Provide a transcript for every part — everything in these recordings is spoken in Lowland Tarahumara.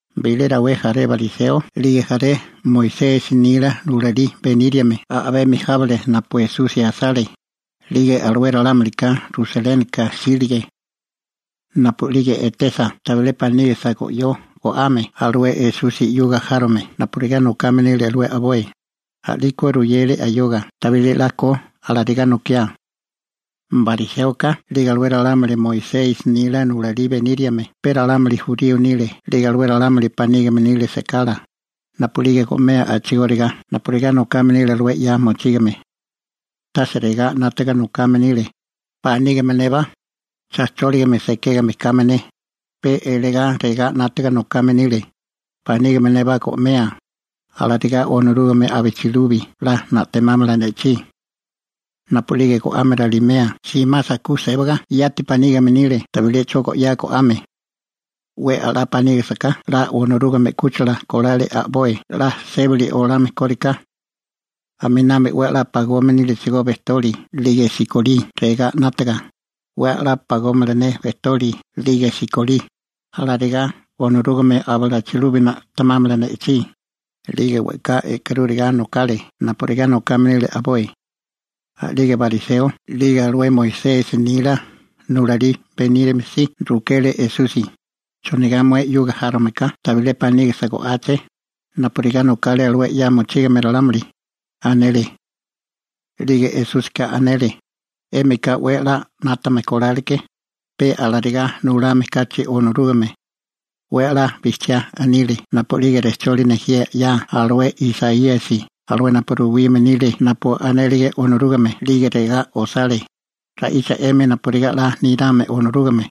Bilé rawé jaré bariseo 'lige jaré Moisesi nila nulalí beníriame a'bemi jábale napu Esusi asale, 'lige alué ralámulika Rusalénika jsílige. Napu'lige etesa tabilé panígisa go'yó go'ame alué Esusi 'yuga járome napurigá nokame nile alué a'boi, a'liko ruyele ayoga tabilé 'la ko alarigá nokiá. (Bariséoka 'lige alué ralámuli Moisesi nila nulalí beníriame pe ralámuli jurío nile 'lige alué ralámuli panígime nile sekala napu'lige go'mea a'chigóriga napurigá nokame nile alué 'ya mochígame. Tase regá 'nátaga nokame nile: «Panígime nébá cha chóligame sekégame kame ne», pe eligá regá 'nátaga nokame nile: «Panígime neba go'mea, alarigá Onorúgame abichilubi 'la na'temámala ne'chí.» Napu'lige go'ame ralimea simasa ku sébaga yati panígime nile tabilé 'cho go'yá go'ame. 'We a'lá panígisiká 'la Onorúgame 'kúchila kolale a'boi 'la sébili olame kóriká. Aminami 'we a'lá pagome nílechigó bejtoli 'lige sikolí regá 'nátaga: «'We a'lá pagómala ne bejtoli 'lige sikolí, alarigá Onorúgame abichilubi na'temámala ne'chí», 'lige we'ká e'karúriga nokale napurigá nokame nile a'boi.) A'lige bariseo 'lige alué Moisesi nila nulalí beníriame si rukele Esusi: ―¿Chonigá mué 'yuga járome ka tabilé panígisa go'áché, napurigá nokale alué 'ya mochígame ralámuli? ―anele. 'Lige Esúsika anele: ―'Émika 'we a'lá 'nátame kolale ke, peka alarigá nulame kachi Onorúgame. 'We a'lá bijchiá anile napu'lige rejcholi nejía 'ya alué Isaíasi alué napu ruwime nile napu anélige Onorúgame, alué regá osale: Ra'icha 'emi napurigá 'la nirame Onorúgame,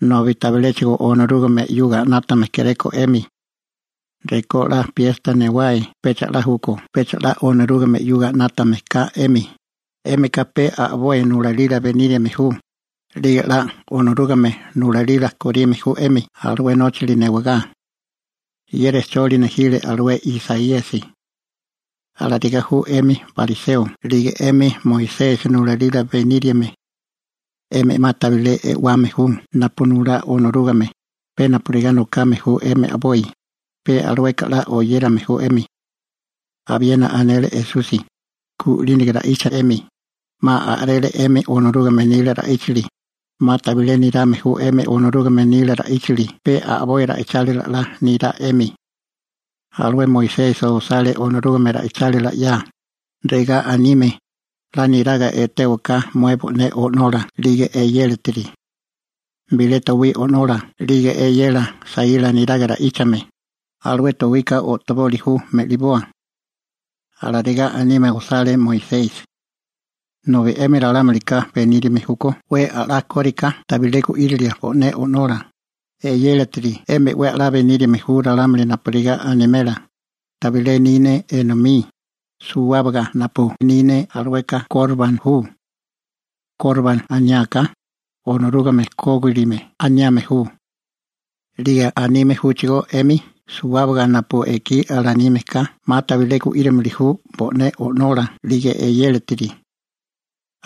nobi tabiléchigo Onorúgame 'yuga 'nátame kéréko 'emi. Rekó 'la piesta newae pecha 'la júkó pecha 'la Onorúgame 'yuga 'nátame ka 'emi, 'émika pe a'boi nulalila beníriame ju, 'lige 'la Onorúgame nulalila korime ju 'emi alué nóchili newagá. Ye rejcholi nejile alué Isaíasi. Alarigá ju 'emi bariseo 'lige 'emi Moisesi nulalila beníriame. 'Emi 'ma tabilé e'wame ju napu nulá Onorúgame, pe napurigá nokame ju 'emi a'boi, pe alueka 'la oyérame ju 'emi. Abiena anele Esusi: ―Gu'línaga ra'icha 'emi, 'ma a'rele 'emi Onorúgame nila ra'íchili, 'ma tabilé nirame ju 'emi Onorúgame nila ra'íchali, pe a'boi ra'ichálila 'la nirá 'emi. Alué Moisesi osale Onorúgame ra'ichálila 'ya, regá anime: «'La niraga etéwaká mué bo'né o'nola 'lige eyélatiri. Bilé towí o'nola 'lige eyela saíla neraga ra'íchame, alué towika o'toboli ju me'liboa.» Alarigá anime osale Moisesi. Nobi 'emi ralámuika beníriame júkó 'we a'lá kóriká tabilé gu'írilia bo'né o'nola, eyélatiri, 'emi 'we a'lá beníriame ju ralámuli napurigá animela: «Tabilé ni ne enomí, suwábaga napu ni ne alueka ‹korban› ju.» (Korban aniáká: «Onorúgame kógilime» aniame ju.) 'Lige anime júchigó 'emi suwábaga napu ekí alanime ka 'ma tabilé gu'írimili ju bo'né o'nola 'lige eyélatiri.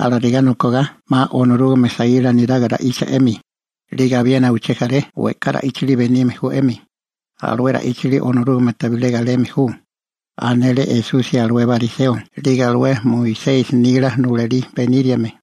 Alarigá nokogá 'ma Onorúgame saíla neraga ra'icha 'emi, 'lige abiena uché jaré we'ká ra'íchali benime ju 'emi, alué ra'íchali Onorúgame tabilé galeme ju ―anele Esusi alué bariseo 'lige alué Moisesi nila nulalí beníriame.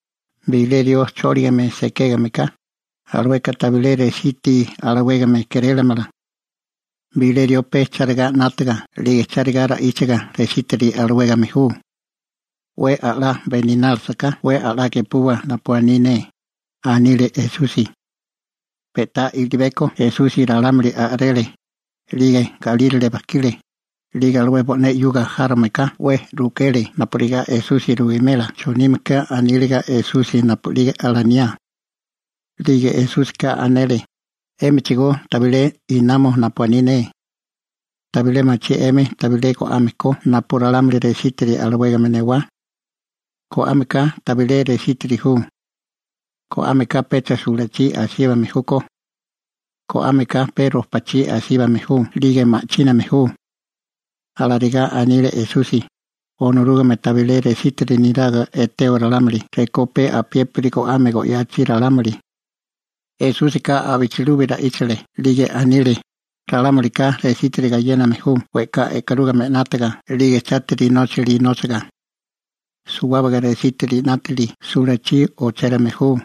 Bilé rió chóligame sekégame ka, alueka tabilé resítiri alawégame kérélamala. Bilé rió pe charigá 'nátaga 'lige chárigá ra'íchaga resítiri alawégame ju. 'We a'lá beninálisiká 'we a'lá gepuwa napu aní ne ―anile Esusi. Pe'tá i'libeko Esusi ralámuli a'rele, 'lige galírale bajkile. 'Lige alué bo'né 'yuga járomeka 'we rukele napurigá Esusi ruwimela chonime ke aníliga Esusi napu'lige alaniá. 'Lige Esúsika anele: ―¿'Émichigó tabilé namo napu aní ne? ¿Tabilé machí 'emi tabilé go'ame ko napu ralámuli resítiri alawégame newá? Go'ame ka tabilé resítiri ju. Go'ame ka pecha sulachí asíbame júkó. Go'ámeka pe rojpachí asíbame ju 'lige ma'chíname ju. (Alarigá anile Esusi, Onorúgame tabilé resítiri neraga eteo ralámuli rekó pe apiépiri go'ame go'yachi ralámuli.) Esúsika abichilubi ra'íchale 'lige anile: ―Ralámulika resítiri gayéname ju we'ká e'karúgame 'nátaga 'lige chátiri nóchali nóchaga. Suwábaga resítiri 'nátili sulachí ochérame ju.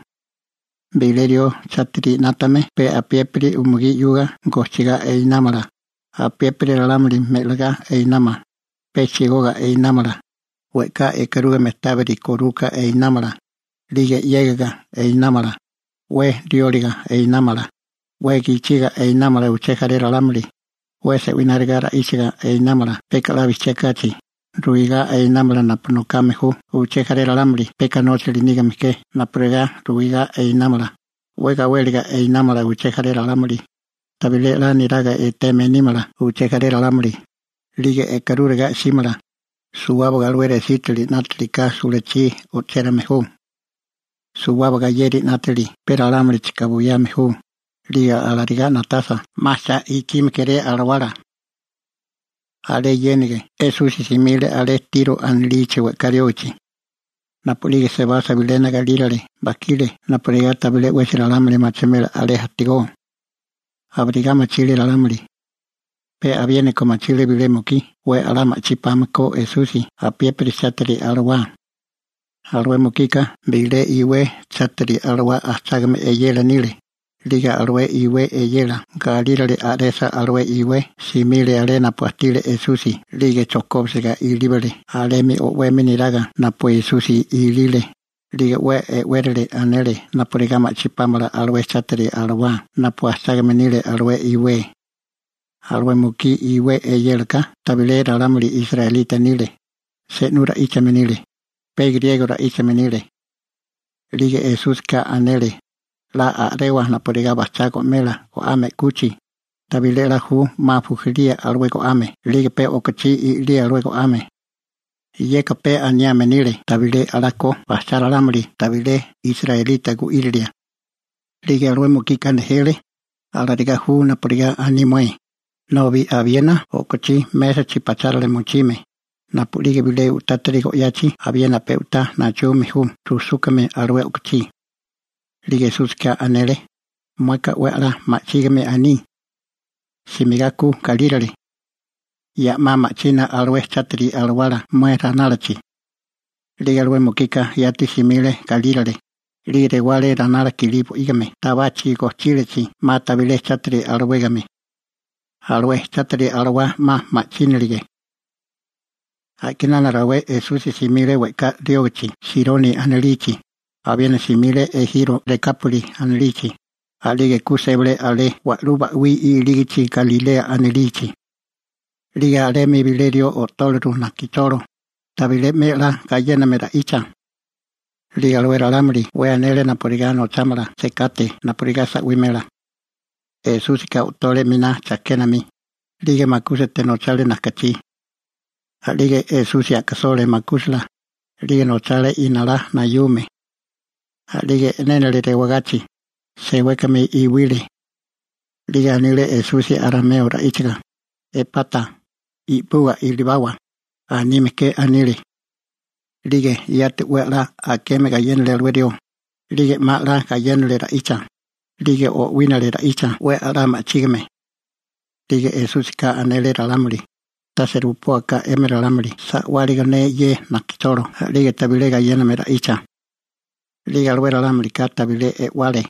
Bilé rió chátiri 'nátame pe apiépiri umugí 'yuga gojchigá einámala, apiépiri ralámuli me'ligá einámala, pe chigoga einámala, we'ká e'karúgame tábiri koruka einámala, 'lige 'yégiga einámala, 'we rióliga einámala, 'we gichiga einámala uché jaré ralámuli, 'we se'wináriga ra'íchaga einámala peka 'la bijchiá kachi (chisme), ruigá einámala napu nokame ju uché jaré ralámuli peka nóchali nígame ke napurigá ruigá einámala, 'we gawéliga einámala uché jaré ralámuli, tabilé 'la niraga eteme nímala uché jaré ralámuli, 'lige e'karúriga 'símala, suwábaga alué resítiri 'nátaliká sulachí o'chérame ju. Suwábaga yeri 'nátili pe ralámulichika buyame ju, 'lige alarigá na'tasa 'ma cha ikime kéré alawala. Alé yéniga, Esusi simile alé Tiro anilichi we'ká riógichi. Napu'lige sebasa bilena galírale bajkile napurigá tabilé 'wesi ralámuli machimela alé ajtigó. Abirigá machile ralámuli. Pe abiéniko machile bilé mukí 'we a'lá ma'chí pame ko Esusi apiépiri chátiri alawá. Alué mukika bilé iwé chátiri alawá ajchágame eyela nile, 'lige alué iwé eyela galírale a'resa alué iwé, simile alé napu ajtile Esusi 'lige chojkóbisiga ilíbale alemi o'wemi neraga napu Esusi ilile, 'lige 'we e'wérili anele napurigá ma'chí pámala alué chátiri alawá napu ajchágame nile alué iwé. Alué mukí iwé eyélaka tabilé ralámuli israelita nile, se'nú ra'íchame nile, pe griego ra'íchame nile. 'Lige Esúsika anele: ―'La a'rewa napurigá bajchá go'mela go'ame 'kuchi, tabilé 'la ju 'ma bujilía alué go'ame 'lige pe o'kochí i'lía alué go'ame. (Yeka pe aniame nile tabilé 'la ko bajchá ralámuli tabilé israelita gu'írilia.) 'Lige alué mukika nejele: ―Alarigá ju napurigá aní mué, nobi abiena o'kochí mésachi pachárale mochime, napu'lige bilé u'tátiri go'yachi abiena pe'tá nachume ju rujsúkame alué o'kochí. 'Lige Esúsika anele: ―Mueka 'we a'lá ma'chígame aní. Simigá ku galírale. Ya'má ma'china alué chátiri alawala mué ranálachi. 'Lige alué mukika yati simile galírale, 'lige rewale ranala kilí bo'ígime tabachi gojchílachi 'ma tabilé chátiri alawégame. Alué chátiri alawá 'ma ma'chínilige. A'kinana rawé Esusi simile we'ká riógichi Sironi anilichi. Abiena simile ejiro Rekápoli anilichi. A'lige ku sébale alé wa'lú ba'wí ilígichi Galilea anilichi. 'Lige alemi bilé rió o'tóleru najkicholo, tabilé 'me 'la gayéname ra'icha. 'Lige alué ralámuli 'we anele napurigá nochámala sekate napurigá sa'wimela. Esúsika o'tole a'miná chajkénami, 'lige makúsate nochale najkachí. A'lige Esusi a'kasole makúsala, 'lige nochale inalá nayume. A'lige e'nénale rewagachi, sewékame iwile. 'Lige anile Esusi arameo ra'íchaga: ―¡Epata! («I'puga ilibawa», anime ke anile.) A'lige yati 'we 'la akeme gayénale alué rió, 'lige 'ma 'la gayénale ra'icha, 'lige o'wínale ra'icha 'we a'lá ma'chígame. 'Lige Esúsika anele ralámuli: ―Tase rupóaká 'emi ralámuli sa'wáligo ne ye najkacholo 'lige tabilé gayéname ra'icha. 'Lige alué ralámulika tabilé e'wale.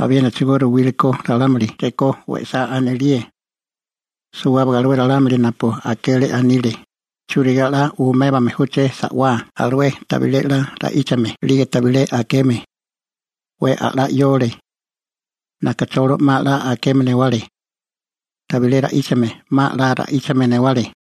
Abiénachigo ruwílikó ralámuli rekó we'sá anelíe. Suwábaga alué ralámuli napu akele, anile: ―¿Churigá 'la umébame júché sa'wá alué tabilé 'la ra'íchame 'lige tabilé akeme? 'We a'lá 'yole. Najkacholo 'ma 'la akeme newale. Tabilé ra'íchame 'ma 'la ra'íchame newale.